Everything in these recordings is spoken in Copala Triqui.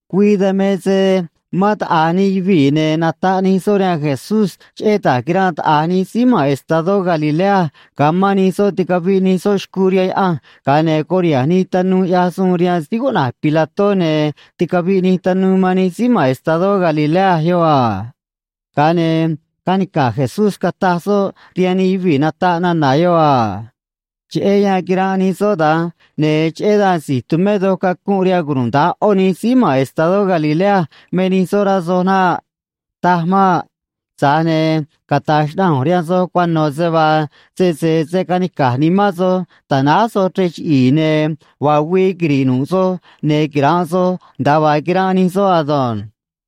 Güii dan me se mán taꞌa̱j nij yuvii̱, ne̱ nataꞌ nij soꞌ rihaan Jesús cheꞌé da̱j quiranꞌ taꞌa̱j nij síí ma̱n estadó Galilea ga̱a mán nij soꞌ ticaviꞌ nij soꞌ xcuu rihaan Yaꞌanj ga̱a ne̱ curiha̱nj nij tanuu ꞌyaj suun rihaan síí cuꞌna̱j Pilató, ne̱ ticaviꞌ nij tanuu man nij síí ma̱n estadó Galilea yoꞌ a. Ga̱a ne̱ canica̱j Jesús cataj soꞌ rihaan nij yuvii̱ nataꞌ nana̱ yoꞌ a: ―Cheꞌé yan quiranꞌ nij soꞌ da̱nj, ne̱ cheꞌé dan si̱j tumé doj cacunꞌ rihaan cunuda̱nj ꞌó nij síí ma̱n estadó Galilea me nij soꞌ, rá soj naꞌ. Taj maꞌ. Tza̱j ne̱ cata̱j xnaꞌanj ꞌu̱nj rihaan soj cuano̱ se vaa sese se̱ canica̱j nimán soj ta̱náj soj chrej chiꞌi̱i̱, ne̱ vaa güii quiri̱ꞌ nu̱ꞌ soj ne̱ quira̱nꞌ soj nda̱a vaa quiranꞌ nij soꞌ ado̱nj.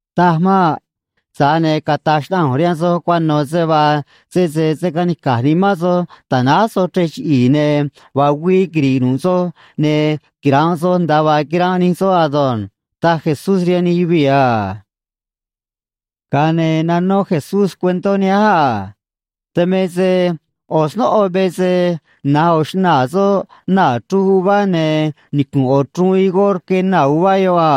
Taj maꞌ. Tza̱j ne̱ cata̱j xnaꞌanj ꞌu̱nj rihaan soj cuano̱ se vaa sese se̱ canica̱j nimán soj ta̱náj soj chrej chiꞌi̱i̱, ne̱ vaa güii quiri̱ꞌ nu̱ꞌ soj ne̱ quira̱nꞌ soj nda̱a vaa quiranꞌ nij soꞌ ado̱nj ―taj Jesús rihaan nij yuvii̱ a. Ga̱a ne̱ nanó Jesús cuentó nihánj a: ―Dan me se ꞌo̱ snóꞌo me se na̱j ꞌo̱ xnaa̱ soꞌ naa̱ chruj uvá, ne̱ nicu̱nꞌ ꞌo̱ chruun higó rque naa̱ uvá yoꞌ a.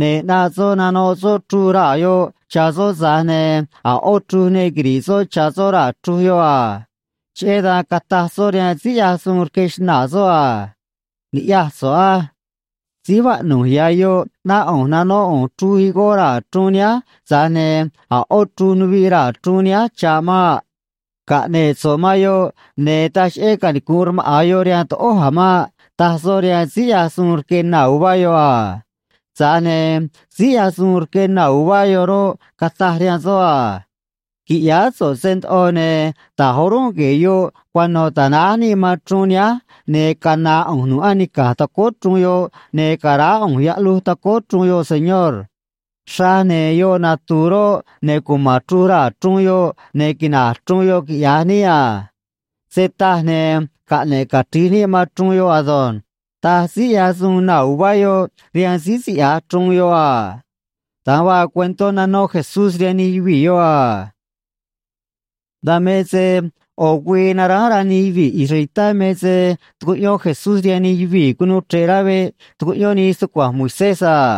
Ne̱ ꞌnaꞌ soꞌ nanoꞌ soꞌ chruj raa̱ yoꞌ cha̱ soꞌ, tza̱j ne̱ a̱ ꞌó chruj ne quiri̱ꞌ soꞌ cha̱ soꞌ raa̱ chruun yoꞌ a. Cheꞌé dan cataj soꞌ rihaan síí ꞌyaj suun rque xnaa̱ soꞌ a: “Ni̱ꞌyaj so̱ꞌ á. Síj vaꞌnu̱j ya̱ yoꞌ ꞌnáꞌ ꞌu̱nj nanóꞌ ꞌu̱nj chruj higó raa̱ chruun nihánj, tza̱j ne̱ a̱ ꞌó chruj nuviꞌ raa̱ chruun nihánj cha̱ꞌ maꞌ. Caꞌne̱ꞌ so̱ꞌ man yoꞌ, ne̱ taj cheꞌé canicu̱nꞌ rmaꞌa̱n yoꞌ rihaan toꞌój a̱ maꞌ”, taj soꞌ rihaan síí ꞌyaj suun rque naa̱ uvá yoꞌ a. Tza̱j ne̱ síí ꞌyaj suun rque naa̱ uvá yoꞌ roꞌ, cataj rihaan soꞌ a: “Qui̱ꞌyáá so̱ꞌ se ndoꞌo, ne̱ da̱j o̱rúnꞌ gue̱e̱ yoꞌ cuano̱ ta̱náj níꞌ man chruun nihánj, ne̱ cana̱a̱ ꞌu̱nj nu̱ꞌ anica̱j tacóó chruun yoꞌ, ne̱ ca̱raá ꞌu̱nj yaꞌluj tacóó chruun yoꞌ, señor. Xraj, ne̱ yoꞌ natu̱u̱ roꞌ, ne̱ cuma̱n chruj raa̱ chruun yoꞌ, ne̱ quina̱j chruun yoꞌ, quiꞌya̱j níꞌ a. Se taj, ne̱ caꞌne̱ꞌ cachri̱j níꞌ man chruun yoꞌ ado̱nj”, taj síí ꞌyaj suun naa̱ uvá yoꞌ rihaan síí siꞌya̱j chruun yoꞌ a ―da̱nj vaa cuentó nanó Jesús rihaan nij yuvii̱ yoꞌ a. Dan me se ꞌo̱ güii naránj rá nij yuvii̱ israelitá me se tucuꞌyón Jesús rihaan nij yuvii̱ cunuu chre̱ꞌ rá veꞌ tucuꞌyón nii stucua̱nj Moisés a.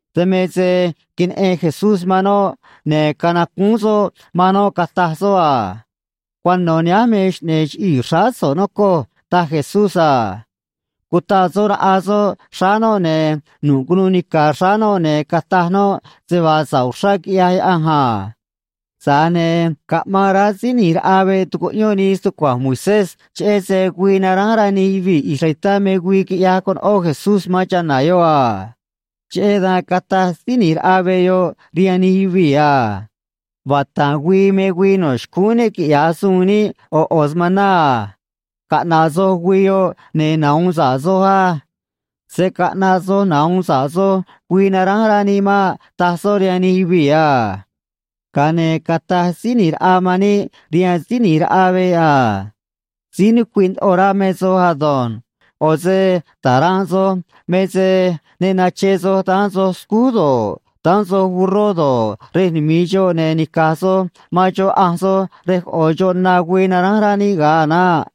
Dan me se queneꞌen Jesús man noꞌ, ne̱ canacúún soꞌ man noꞌ, cataj soꞌ a: ―Cuano̱ nihánj me xꞌne̱e̱ chiꞌii̱ xráá so̱ꞌ, nocoj ―taj Jesús a. Cutaꞌ soꞌ raꞌa soꞌ xráá noꞌ, ne̱ nu̱ꞌ cunuu nica̱ xráá noꞌ, ne̱ cataj noꞌ se vaa sa̱ꞌ uxrá quiꞌyaj Yaꞌanj a. Tza̱j ne̱ caꞌmaan rá síí ꞌni̱j raꞌa veꞌ tucuꞌyón nii stucua̱nj Moisés, cheꞌé se güii naránj rá nij yuvii̱ israelitá me güii quiꞌyaj conoꞌó Jesús man chana̱ yoꞌ a. Cheꞌé dan cataj síí ꞌni̱j raꞌa veꞌ yoꞌ rihaan nij yuvii̱ a: ―Vata̱nꞌ güii me güii no̱ xcúún níꞌ quiꞌya̱j suun níꞌ ꞌo̱ ꞌo̱ smaná a. Caꞌna̱ꞌ soj güii yoꞌ, ne̱ nahu̱un sa̱ꞌ soj á. Se̱ caꞌnaꞌ soj nahu̱un sa̱ꞌ soj güii naránj rá níꞌ maꞌ ―taj soꞌ rihaan nij yuvii̱ a. Ga̱a ne̱ cataj Síí ꞌNi̱j Raꞌa man níꞌ rihaan síí ꞌni̱j raꞌa veꞌ a: ―Síí nucuiꞌ ndoꞌo rá me soj ado̱nj. ꞌO̱ se ta̱ranꞌ soj me se ne nache soj daán soj scúj do̱ꞌ, daán soj burró do̱ꞌ, rej numi̱i xoꞌ, ne̱ nica̱j soj man xoꞌ ꞌanj soj rej coꞌo̱ xoꞌ na güii naránj rá níꞌ ga̱a a̱ naꞌ.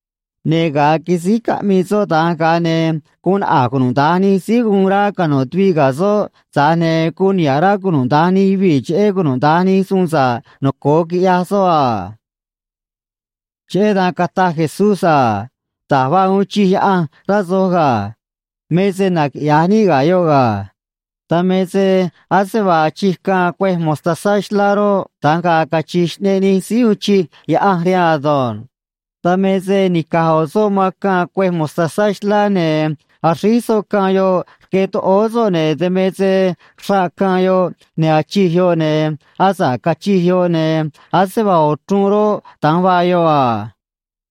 Ne̱ ga̱a quisíj caꞌmii soꞌ da̱nj, ga̱a ne̱ guun naꞌa̱j cunuda̱nj nij síí guun rá cano̱ tuviꞌ ga̱ soꞌ, tza̱j ne̱ guun niha̱ꞌ rá cunuda̱nj nij yuvii̱ cheꞌé cunuda̱nj nij suun sa̱ꞌ noco̱o quiꞌyaj soꞌ a. Cheꞌé dan cataj Jesús a: ―Da̱j vaa uun chij Yaꞌanj, rá soj ga̱. Me se naquiꞌya̱j níꞌ ga̱ yoꞌ ga̱. Dan me se ase vaa achij caân cuêj mostazá xlá roꞌ, da̱nj ga̱a̱ cachi̱j xꞌneꞌ nij síí uun chij Yaꞌanj rihaan ado̱nj. Dan me se nica̱j ꞌo̱ soꞌ man caân cuêj mostazá xlá ne̱ axríj soꞌ caân yoꞌ rque toꞌóó soꞌ, ne̱ dan me se xraꞌ caân yoꞌ, ne̱ achij yoꞌ, ne̱ asa̱ꞌ cachij yoꞌ, ne̱ ase vaa ꞌo̱ chruun roꞌ, da̱nj vaa yoꞌ a.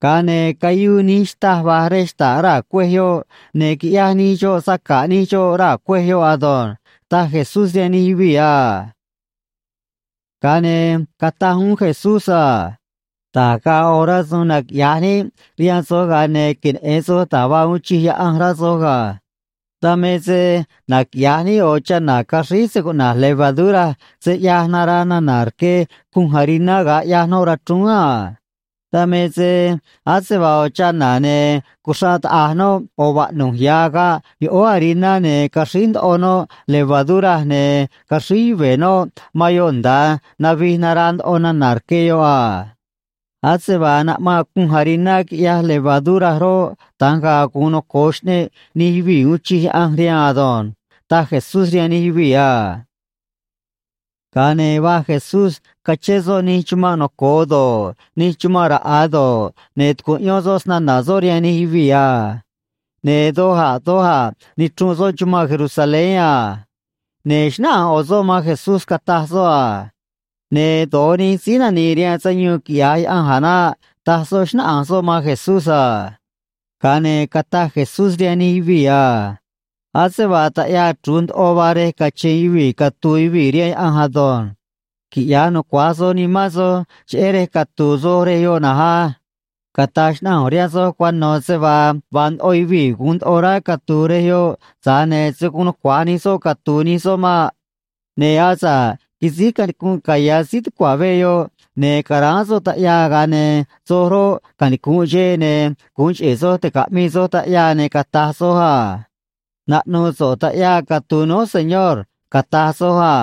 Ga̱a ne̱ cayuu nij xtâj va̱j rej xta̱ꞌ raa̱ cuêj yoꞌ, ne̱ quiꞌyaj nij xoꞌ saca̱ꞌ nij xoꞌ raa̱ cuêj yoꞌ ado̱nj ―taj Jesús rihaan nij yuvii̱ a. Ga̱a ne̱ cataj uún Jesús a: ―Da̱j ga̱a̱ ꞌo̱ rasu̱u̱n naquiꞌya̱j níꞌ rihaan soj, ga̱a ne̱ queneꞌe̱n soj da̱j vaa uun chij Yaꞌanj, rá soj ga̱. Dan me se naquiꞌya̱j níꞌ ꞌo̱ chana̱ caxríj se cuꞌna̱j levadura se ꞌyaj naraa nana̱ rque cunj hariná ga̱a ꞌyaj noꞌ rachrúún a. Dan me se ase vaa ꞌo̱ chana̱, ne̱ cuxraꞌ taꞌa̱j noꞌ ꞌo̱ vaꞌnu̱j ya̱ agaꞌ yoꞌóó hariná, ne̱ caxríj ndoꞌo noꞌ levadura, ne̱ caxríj yuve̱ noꞌ man yoꞌ nda̱a navij naraa ndoꞌo nana̱ rque yoꞌ a. Ase vaa naꞌmanꞌ cunj hariná quiꞌyaj levadura roꞌ, da̱nj ga̱a̱ gu̱un noco̱o xꞌneꞌ nij yuvii̱ uun chij Yaꞌanj rihaan ado̱nj ―taj Jesús rihaan nij yuvii̱ a. Ga̱a ne̱ va̱j Jesús cachén soꞌ nij chumanꞌ noco̱o do̱ꞌ, nij chumanꞌ raꞌa̱ do̱ꞌ, ne̱ tucuꞌyón soꞌ snana̱ soꞌ rihaan nij yuvii̱ a. Ne̱ doj a̱ doj a̱ nichrunꞌ soꞌ chumanꞌ Jerusalén a. Ne̱ xnáꞌanj ꞌo̱ soꞌ man Jesús, cataj soꞌ a: ―Ne̱ do̱j nij síí nani̱i̱ rihaan sayuun, quiꞌya̱j Yaꞌanj a̱ naꞌ ―taj soꞌ, xnáꞌanj soꞌ man Jesús a. Ga̱a ne̱ cataj Jesús rihaan nij yuvii̱ a: ―Ase vaa taꞌyaa chru̱j ndoꞌo vaa rej cache̱n yuvii̱ catu̱u̱ yuvii̱ rihaan Yaꞌanj ado̱nj. Quiꞌya̱j nucua̱j soj nimán soj cheꞌé rej catu̱u̱ soj rej yoꞌ na̱nj á. Cata̱j xnaꞌanj ꞌu̱nj rihaan soj cuano̱ se vaa vaa ndoꞌo yuvii̱ gu̱un ndoꞌo rá catu̱u̱ rej yoꞌ, tza̱j ne̱ se̱ guun nucua̱j nij soꞌ catu̱u̱ nij soꞌ maꞌ. Ne̱ asa̱ꞌ quisíj canicunꞌ caya̱ síí tucua̱ veꞌ yoꞌ ne̱ caráán soꞌ taꞌyaa, ga̱a ne̱ soj roꞌ, canicu̱nꞌ xeꞌ, ne̱ gu̱un cheꞌe̱ soj ti̱caꞌmii soj taꞌyaa, ne̱ cata̱j soj a: “Naꞌnu̱u̱ so̱ꞌ taꞌyaa catu̱u̱ núj, Señor”, cata̱j soj a.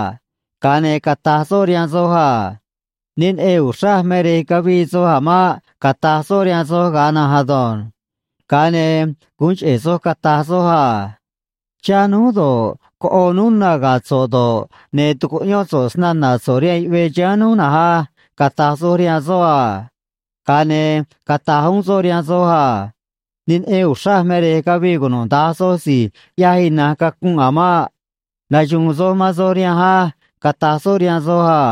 Ga̱a ne̱ cata̱j soꞌ rihaan soj a: “Ne neꞌen uxraj me rej cavii soj a̱ maꞌ”, cata̱j soꞌ rihaan soj ga̱a na̱nj ado̱nj. Ga̱a ne̱ gu̱un cheꞌe̱ soj cata̱j soj a: “Chá núj do̱ꞌ, coꞌo núj na ga̱ so̱ꞌ do̱ꞌ, ne̱ tucuꞌyón so̱ꞌ snana̱ so̱ꞌ rihaan yuꞌvee chiháán núj na̱nj á”, cata̱j soj rihaan soꞌ a. Ga̱a ne̱ cata̱j uún soꞌ rihaan soj a: “Ne neꞌen uxraj me rej cavii cunuda̱nj soj si̱j ꞌyaj ina̱nj cacunꞌ a̱ maꞌ. Naxu̱u̱n soj man soj rihanj á”, cata̱j soꞌ rihaan soj a.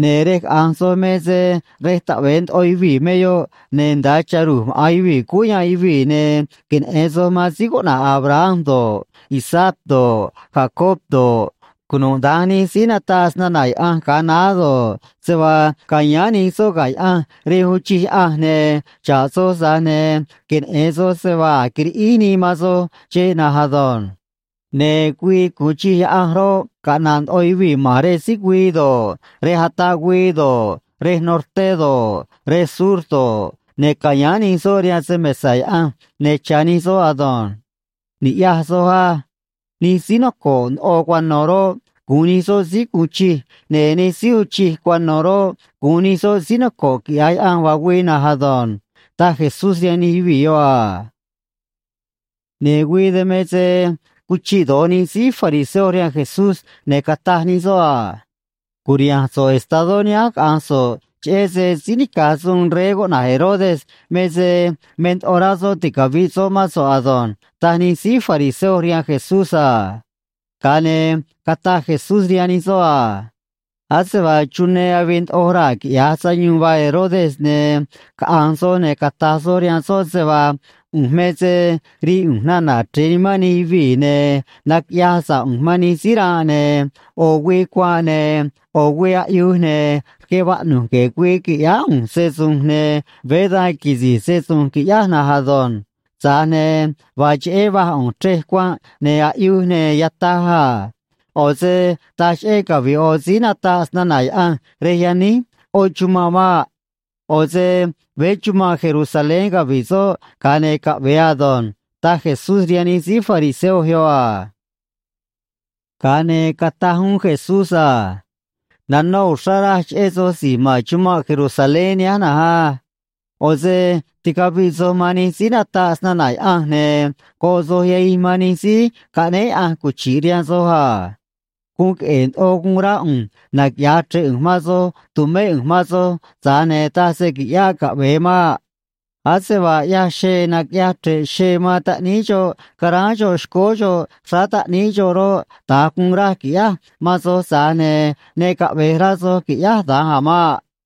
’Ne̱ rej caꞌa̱nj soj me se rej taꞌve̱e ndoꞌo yuvii̱ me yoꞌ, ne̱ nda̱a cha̱ ru̱j maꞌa̱n yuvii̱ cúú yanꞌ yuvii̱, ne̱ queneꞌe̱n soj man síí cuꞌna̱j Abraham do̱ꞌ, Isaac do̱ꞌ, Jacob do̱ꞌ, cunuda̱nj nij síí nataꞌ snana̱ Yaꞌanj ga̱a naá do̱ꞌ, se vaa ca̱yáán nij soꞌ ga̱ Yaꞌanj rej uun chij Yaꞌanj, ne̱ xa̱ꞌ soj, tza̱j ne̱ queneꞌe̱n soj se vaa a̱j quiriꞌíj nii man soj xeꞌ na̱nj ado̱nj. Ne̱ güii gu̱un chij Yaꞌanj roꞌ, caꞌna̱ꞌ ndoꞌo yuvii̱ ma̱n rej síj güii do̱ꞌ, rej ataꞌ güii do̱ꞌ, rej norté do̱ꞌ, rej sur do̱ꞌ, ne̱ ca̱yáán nij soꞌ rihaan se‑mesa̱ Yaꞌanj, ne̱ cha̱ nij soꞌ ado̱nj. Ni̱ꞌyaj soj á. Nij síí noco̱ꞌ ndoꞌo cuano̱ roꞌ, gu̱un nij soꞌ síí gu̱un chij, ne̱ nij síí uun chij cuano̱ roꞌ, gu̱un nij soꞌ síí noco̱ꞌ, quiꞌya̱j Yaꞌanj vaa güii na̱nj ado̱nj ―taj Jesús rihaan nij yuvii̱ yoꞌ a. Ne̱ güii dan me se cuchiꞌ do̱j nij síí fariseo rihaan Jesús, ne̱ cataj nij soꞌ a: ―Cu̱riha̱nj so̱ꞌ estadó nihánj caꞌa̱nj so̱ꞌ, cheꞌé se síí nica̱j suun rey cuꞌna̱j Herodes me se me ndoꞌo rá soꞌ ticavi̱ꞌ soꞌ mán so̱ꞌ ado̱nj ―taj nij síí fariseo rihaan Jesús a. Ga̱a ne̱ cataj Jesús rihaan nij soꞌ a: ―Ase vaa chunee avii ndoꞌo raa̱ quiꞌya̱j sayuun vaa Herodes, ne̱ caꞌa̱nj soj, ne̱ cata̱j soj rihaan soꞌ se vaa ꞌu̱nj me se rii ꞌu̱nj nana̱ chre̱e nimán nij yuvii̱, ne̱ naquiꞌyaj sa̱ꞌ ꞌu̱nj man nij síí ranꞌ, ne̱ ꞌo̱ güii cuanꞌ ne̱ ꞌo̱ güii aꞌyuj ne̱ rque vaꞌnu̱j gue̱e̱ güii qui̱ꞌyáá ꞌu̱nj se‑su̱nj, ne̱ veé da̱nj quisi̱j se‑su̱nj, qui̱ꞌyáj na̱nj ado̱nj. Tza̱j ne̱ vaa cheꞌé va̱j ꞌu̱nj chrej cuanꞌ ne̱ aꞌyuj ne̱ yataj a. ꞌO̱ se taj cheꞌé cavi̱ꞌ ꞌo̱ síí nataꞌ snana̱ Yaꞌanj rej yaníj ꞌó chumanꞌ maꞌ. ꞌO̱ se veé chumanꞌ Jerusalén cavi̱ꞌ soꞌ ga̱a ne̱ caꞌve̱e ado̱nj ―taj Jesús rihaan nij síí fariseo yoꞌ a. Ga̱a ne̱ cataj uún Jesús a: ―Nanó uxrá raj cheꞌé soj si̱j ma̱n chumanꞌ Jerusalén nihánj na̱nj á. ꞌO̱ se ticaviꞌ soj man nij síí nataꞌ snana̱ Yaꞌanj, ne̱ goꞌ soj yahij man nij síí caꞌnéé Yaꞌanj cuchi̱ꞌ rihaan soj a. Guun queꞌe̱e̱ ndoꞌo guun rá ꞌu̱nj naquiꞌya̱j chre̱ꞌ ꞌu̱nj man soj tu̱mé ꞌu̱nj man soj, tza̱j ne̱ taj se quiꞌyáꞌ caꞌvee maꞌ. Ase vaa ꞌyaj xee naquiꞌyaj chre̱ꞌ xee man taꞌníí xoꞌ ca̱ráán xoꞌ xcóó xoꞌ xráá taꞌníí xoꞌ roꞌ, da̱nj guun raj qui̱ꞌyáj man soj, tza̱j ne̱ ne caꞌve̱j rá soj qui̱ꞌyáj da̱nj a̱ maꞌ.